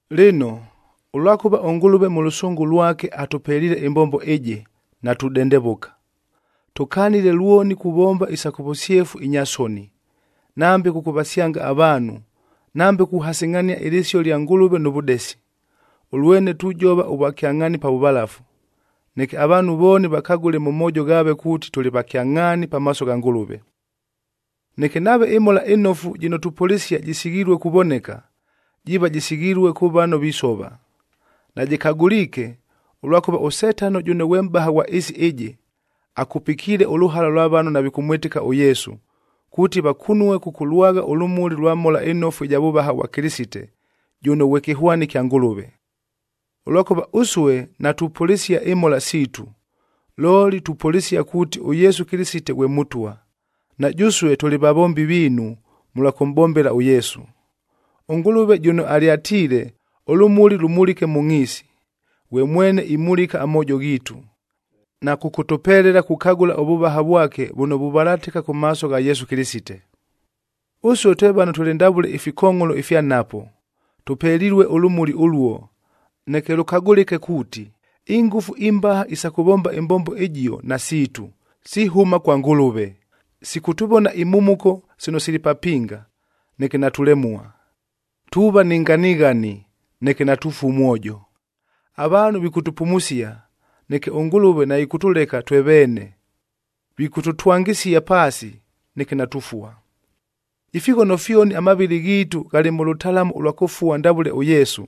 Lɨno, ʉlwakʉva ʉNgʉlʉve mʉ lʉsʉngʉ lwake atʉpeliile ɨmbombo ɨjɨ, natudendevʉka. Tʉkanile lwoni kuvomba isa kʉ vʉsyefu inya soni, nambe kʉkʉvasyanga avaanhu, nambe kuhasɨngʼhania ɨlɨsio lya Ngʉlʉve nʉ vʉdesi. Ʉlwene tujova ʉvwakyangʼhaani pa vʉvalafu, neke avaanhu vooni vakagʉle mʉ moojo ghaave kuuti tʉlɨ va kyangʼhaani pamaaso gha Ngʉlʉve. Neke nave ɨMhola ɨNofu jɨno tupʉlɨsia jɨsighilue kuvoneka, jiiva jɨsighilue kʉ vano visova. Najɨkagʉliike, ʉlwakʉva ʉSetano jʉno ghwe mʼbaha ghwa ɨɨsi ɨjɨ, akupikiile ʉlʉhala lwa vano navikʉmwɨtɨka ʉYesu, kuuti vakunue kʉkʉlwagha ʉlʉmuli ʉlwa Mhola ɨNofu ɨja vʉvaha vwa Kɨlɨsite, jʉno ghwe kɨhwani kya Ngʉlʉve. Ʉlwakʉva ʉsue natupʉlɨsia imhola siitu, looli tupʉlɨsia kuuti ʉYesu Kɨlɨsite ghwe Mʉtwa, na jʉsue tʉlɨ vavombi viinu mʉlwa kʉmʼbombela ʉYesu. ɄNgʉlʉve jʉno alyatiile, “Ʉlʉmuli lʉmulike mʉ ngʼhiisi,”a ghwe mwene imulika amoojo ghiitu, na kʉkʉtʉpelela kukagʉla ʉvʉvaha vwake vʉno vuvalatɨka kʉ maaso gha Yesu Kɨlɨsite. Ʉsue twe vano tʉlɨ ndavʉle ifikongʼholo ifya nhapo, tʉpelilue ʉlʉmuli ʉluo, neke lʉkagʉlɨke kuuti, ingʉfu imbaha isa kʉvomba ɨmbombo ɨjio nasiitu, sihʉma kwa Ngʉlʉve. Sikʉtʉvona imhumuko sino sili papinga, neke natulemua; tuuva ni nganighani, neke natufua mwojo. Avaanhu vikʉtʉpumusia, neke ʉNgʉlʉve naɨkʉtʉleka twe veene; vikʉtʉtwangɨsia paasi, neke natufua. Ifighono fyoni amavɨlɨ ghiitu ghalɨ mʉ lʉtalamu ʉlwa kʉfua ndavʉle ʉYesu,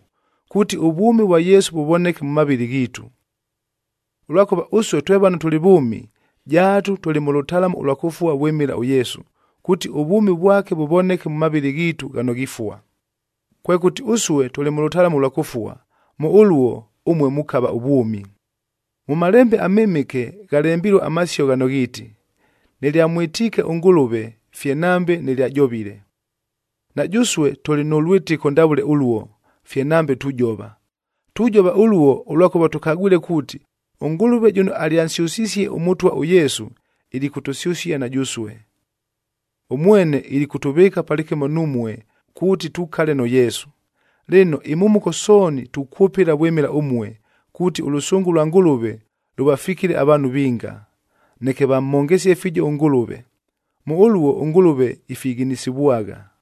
kuuti ʉvwʉmi vwa Yesu vʉvoneke mʉ mavɨlɨ ghiitu. Ʉlwakʉva ʉsue twe vano tʉlɨ vʉʉmi, jaatu tʉlɨ mʉ lʉtalamu ʉlwa kʉfua vwɨmɨla ʉYesu, kuuti ʉvwʉmi vwake vʉvoneke mʉ mavɨlɨ ghiitu ghano ghifua. Kwekʉti, ʉsue tʉlɨ mʉ lʉtalamu ʉlwa kʉfua, mʉ ʉluo, ʉmue mukava ʉvwʉmi. Mʉ Malembe aMɨmɨke ghalembilue amasio ghano ghiiti, “Nɨlyamwɨtiike ʉNgʉlʉve fye nambe nɨlyajovile.”b Na jʉsue tʉlɨ nʉ lwɨtɨko ndavʉle ʉluo, fye nambe tujova. Tujova ʉluo, ʉlwakʉva tʉkagwile kuuti ʉNgʉlʉve jʉno alyansyʉsisie ʉMʉtwa ʉYesu, ilikʉtʉsyʉsia na jʉsue. Ʉmwene ilikʉtʉvɨɨka palɨkɨmo numue, kuuti tukale nʉ Yesu. Lɨno, imhumuko sooni tukwʉpɨla vwɨmɨla ʉmue, kuuti ʉlʉsʉngʉ lwa Ngʉlʉve lʉvafikile avaanhu vinga, neke vamhongesyaghe fiijo ʉNgʉlʉve. Mʉ ʉluo ʉNgʉlʉve ifighinisivwagha.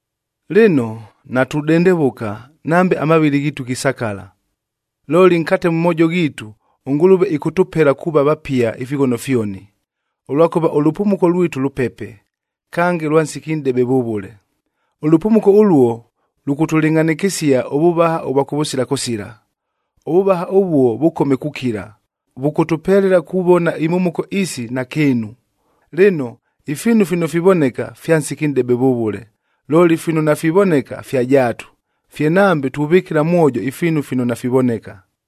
Lɨno, natudendevʉka nambe amavɨlɨ ghiitu ghisakala, looli nkate mʉ moojo ghiitu ʉNgʉlʉve ɨkʉtʉpela kuuva vapia ifighono fyoni. Ʉlwakʉva ʉlʉpumuko lwitu lʉpepe, kange lwa nsiki nʼdebe vʉvʉle. Ʉlʉpumuko ʉluo, lʉkʉtʉlɨngʼhanɨkɨsia ʉvʉvaha ʉvwa kʉvʉsila kʉsila. Ʉvʉvaha ʉvuo vʉkome kukila, vʉkʉtʉpelela kuvona imhumuko isi nakɨɨnu. Lɨno, ifiinu fino fivoneka, fya nsiki nʼdebe vʉvʉle, looli fino nafivoneka fya jaatu, fye nambe tuvɨkɨla mwojo ifiinu fino nafivoneka.